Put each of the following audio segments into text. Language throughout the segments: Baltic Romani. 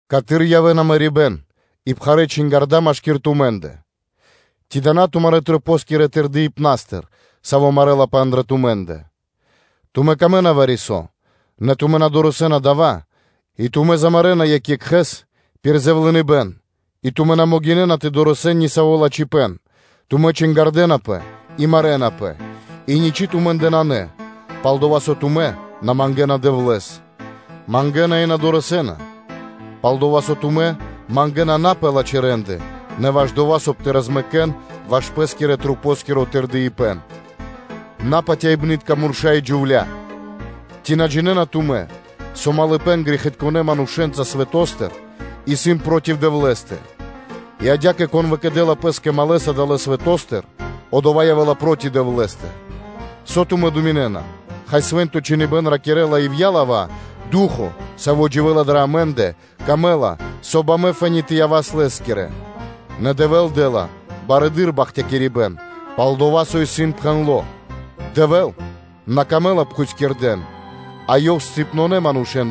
Каты́р явэ́ла марибэ́н пал лава́ и чингарда́ машки́р тумэ́ндэ? Ци дава́ на тумарэ́ масэнгирэ тырдыпнастыр, саво́ марэлапэ андрэ́ тумэ́ндэ? Тумэ́ камэ́на вари-со, нэ тумэ́ на дорэсэ́на дава́, и тумэ́ замарэна (мулякирэна) екх екхэ́с пир дова́, со тумэ́ дэ́на якхало и тумэ́ на могинэ́на тэ дорэсэн ни саво́ лачхипэ́н, тумэ́ чингардэнапэ и марэнапэ пал лава́ и ничы́ тумэ́ндэ нанэ, пал-дова́ со тумэ́ на мангэна Дэвлэ́с. Мангэна и на дорэсэ́на, пал-дова́ со тумэ́ мангэна на пэ лачхэ́ рэ́нды, нэ ваш дова́, соб (кай) тэ розмэкэн ваш пэ́скирэ маса́. Напатяибнытка мурша́ и джувля́! Ци на джинэ́на тумэ́, со малыпэн (дружба) грэхитконэ́ манушэ́нца свэто́стыр исын проти Дэвлэ́стэ? И адя́кэ, кон выкэдэ́ла пэ́скэ малэ́с (друго́с) адалэ́ свэто́стыр, одова́ явэ́ла проти Дэвлэ́стэ. Со тумэ́ думинэ́на, хай, Свэ́нто Чхиныбэ́н ракирэ́ла ивья́ лава́: “Ду́хо (Фа́но), Саво́ дживэ́ла дрэ амэ́ндэ, кэрэ́ла пэ́скэ, соб (кай) амэ фэ́ни тэ явас Лэ́скирэ?” Нэ Дэвэ́л дэ́ла барэды́р бахтякирибэ́н. Пал-дова́ со и исын пхэндло́: “Дэвлэ́скэ исын на дро́га пхутькирдэ́, а Ёв бахтякирэ́ла напхутькирдэ манушэ́н.”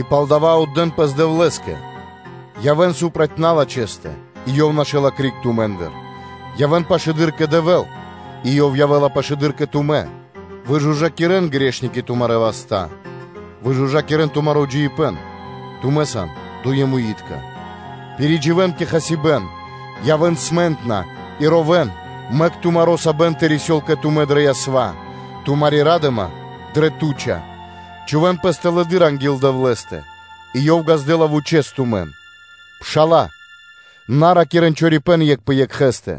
И палдава́ отдэ́н пэс Дэвлэ́скэ, явэ́н проти налачхэстэ и Ёв нашэла криг тумэ́ндыр. Явэ́н пашылэды́р кэ Дэвэ́л, и Ёв явэ́ла пашылэды́р кэ тумэ́. Выжужакирэн грэхи́тка, тумарэ́ васта́. Выжужакирэн тумаро́ джиибэ́н, тумэ́ сан дуемитка. Пиридживэн кэ хасибэ́н, тугинэн зоралэ́с и ровэ́н, мэк тумаро́ сабэн тэ рисёл кэ тумэ́ дрэ ясва, тумари́ ра́дыма дрэ туча. Чхувэ́н пэс тэлэды́р анги́л Дэвлэ́стэ, и Ёв ґаздэ́ла вучэ́с тумэн. Пшала́лэ, на ракирэ́н чорипэ́н екх пэ екхэ́стэ.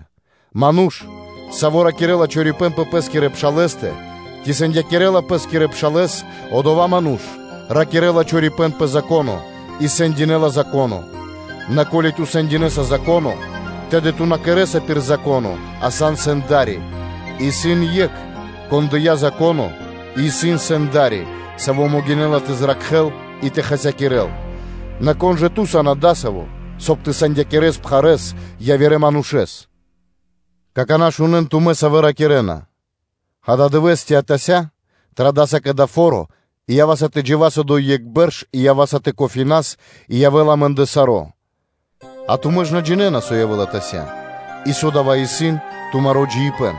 Ману́ш, саво́ ракирэ́ла чорипэ́н пэ пэ́скирэ пшалэ́стэ, ци сэндинэла пэ́скирэ пшалэ́с, одова́ ману́ш ракирэ́ла чорипэ́н пэ Зако́но и сэндинэла Зако́но. Нэ ко́ли ту сэндинэса Зако́но, тэды ту на кэрэ́са пир Зако́но, а ту сан сэнда́ри. Исын Екх, Кон дыя́ Зако́но и исын Сэнда́ри, Саво́ могинэ́ла тэ зракхэ́л и тэ хасякирэ́л: нэ кон жа ту сан адасаво́, соб (кай) тэ сэндинэс пхарэ́с явирэ манушэ́с? Какана́ шунэ́н тумэ́, савэ́ ракирэ́на: “Ададывэ́с ци атася́ традаса кэ дасаво фо́ро, и ява́са тэ джива́с одо́й екх бэрш, и ява́са тэ кофаринас и явэ́ла амэ́ндэ саро́; а тумэ́ ж на джинэ́на, со явэ́ла атася́, и со дава́ исын тумаро́ джиибэ́н?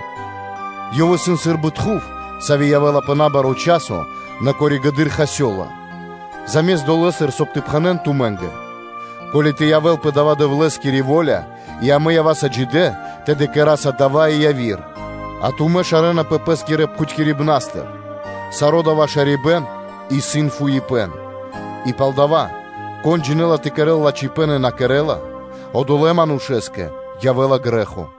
Ёв исын сы́рбы тхув, саво́ явэ́ла пэ набаро́ часо, нэ коригэды́р (позжэ) хасёла; заме́ст дова́, соб (кай) тэ пхэнэ́н тумэ́нгэ: “Ко́ли тэ явэ́л пэ дава́ Дэвлэ́скири во́ля, и, ко́ли амэ ява́са джидэ́, тэды кэра́са дава́ и яви́р.” А тумэ́ шарэнапэ пэ́скирэ пхутькирибнастыр: саро́ дасаво шарибэ́н исын фуипэ́н. И палдава́, кон джинэ́ла тэ кэрэ́л лачхипэ́н и на кэрэ́ла, одолэ́ манушэ́скэ явэ́ла грэ́хо.